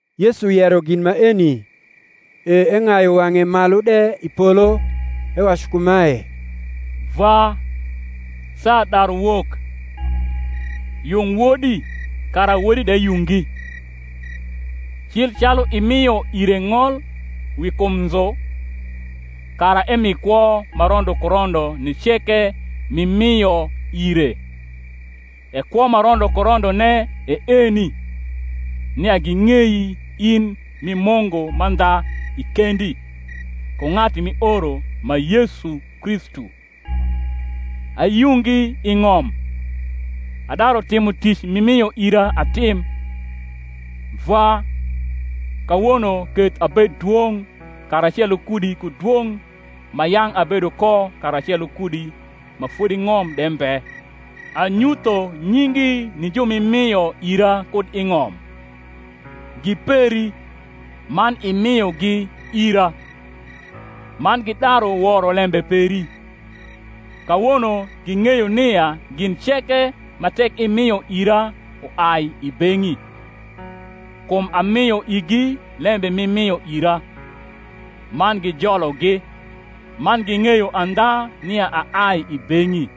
Yesu yero gin maeni; e eng’ayu wang’e malu de i polo, ewacu kumae, Vwa, saa daru wok; yung Wodi, kara Wodi de yungi: cil calu imio ire ng’ol wi kum nzu, kara emi kwo ma rondo ku rondo ni ceke m’imio ire. E kwo ma rondo ku rondone e eni, nia ging’ei in m’i Mungu mandha i kendi, ku ng’atu m’ioro, ma Yesu Kristu. Ayungi i ng’om, adaru timo tic m’imio ira atim. Vwa, kawono keth abed dwong’ karacelo kudi ku dwong’ ma yang’ abedo ko karacelo kudi ma fodi ng’om de mbe. Anyutho nyingi ni ju m’imio ira kud i ng’om: gi peri, man imiogi ira: man gidaru woro lembe peri. Kawono ging’eyo nia gin ceke ma tek imio ira uai i beng’i: kum amio igi lembe m’imio ira; man gijologi, man ging’eyo andha nia aai i beng’i,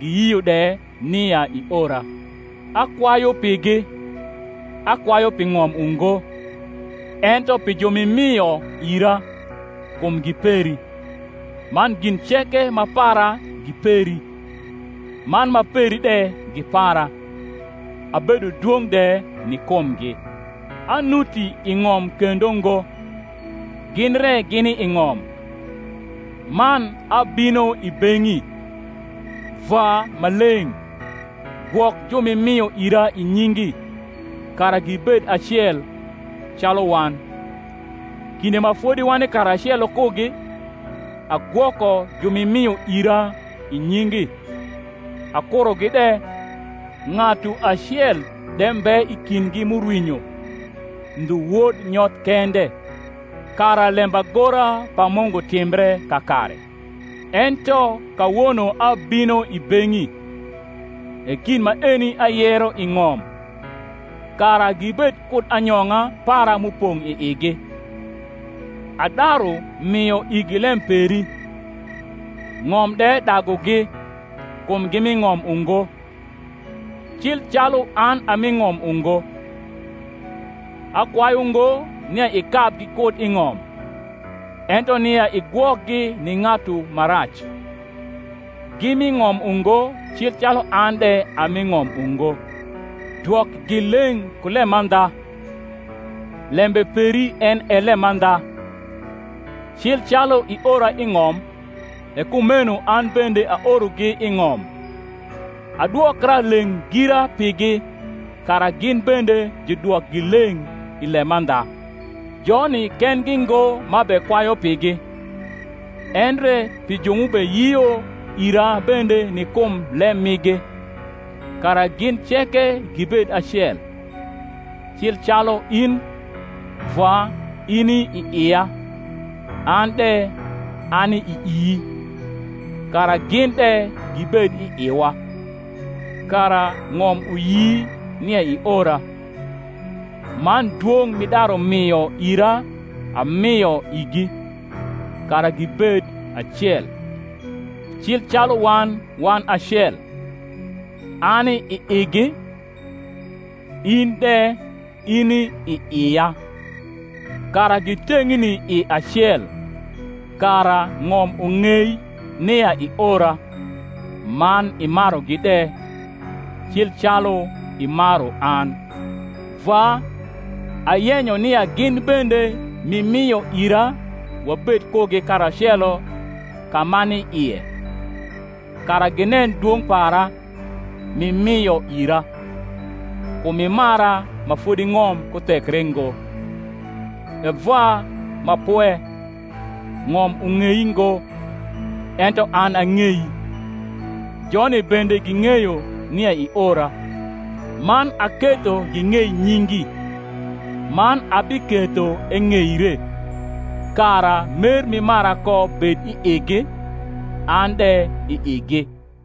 giyio de nia iora. Akwayu pigi: akwayu pi ng’om ungo, ento pi ju m’imio ira; kum gi peri: man gin ceke ma para gi peri, man ma peri de gi para: abedo dwong’ de ni kumgi. Anuti i ng’om kendo ngo, gin re gini i ng’om, man abino i beng’i. Vwa Maleng’, gwok ju m’imio ira i nyingi, kara gibed acel, calu wan. Kinde ma fodi wani karacelo kugi, agwoko ju m’imio ira i nyingi: akurogi de, ng’atu acel de mbe i kindgi m’urwinyo, ndhu wod nyoth kende; kara lembagora pa Mungu timbre kakare. Ento kawono abino i beng’i; e gin maeni ayero i ng’om, kara gibed kud anyong’a para m’upong’ i igi. Adaru mio igi lem peri; ng’om de dagugi, kum gi mi ng’om ungo, cil calu an a mi ng’om ungo. Akwayu ngo nia ikabgi kud i ng’om, ento nia igwokgi ni ng’atu ma rac. Gi mi ng’om ungo cil calu an de a mi ng’om ungo. Dwokgi leng’ ku lemandha: lembe peri en e lemandha. Cli calu iora i ng’om, e kumeno an bende aorogi i ng’om. Adwokra leng’ gira pigi, kara gin bende judwokgi leng’ i lemandha. Joni kendgi ngo m’abekwayu pigi, endre pi ju m’ubeyio ira bende ni kum lem migi; kara gin ceke gibed acel; cil calu in, Vwa, ini i ia, an de ani ii, kara gin de gibed i iwa: kara ng’om uyi nia iora. Man dwong’ m’idaru mio ira amio igi; kara gibed acel, cil calu wan wan acel; ani i igi, in de ini i ia, kara giteng’ni i acel; kara ng’om ung’ei nia iora, man imarugi de, cil calu imaru an. Vwa, ayenyo nia gin bende m’imio ira wabed kugi karacelo ka m’ani ie, kara ginen dwong’ para, m’imio ira: kum imara ma fodi ng’om ku thekre ngo. E Vwa ma pwe, ng’om ung’ei ngo, ento an ang’ei; joni bende ging’eyo nia iora; man aketho ging’ei nyingi, man abiketho eng’eire: kara mer m’imara ko bed i igi, an de i igi.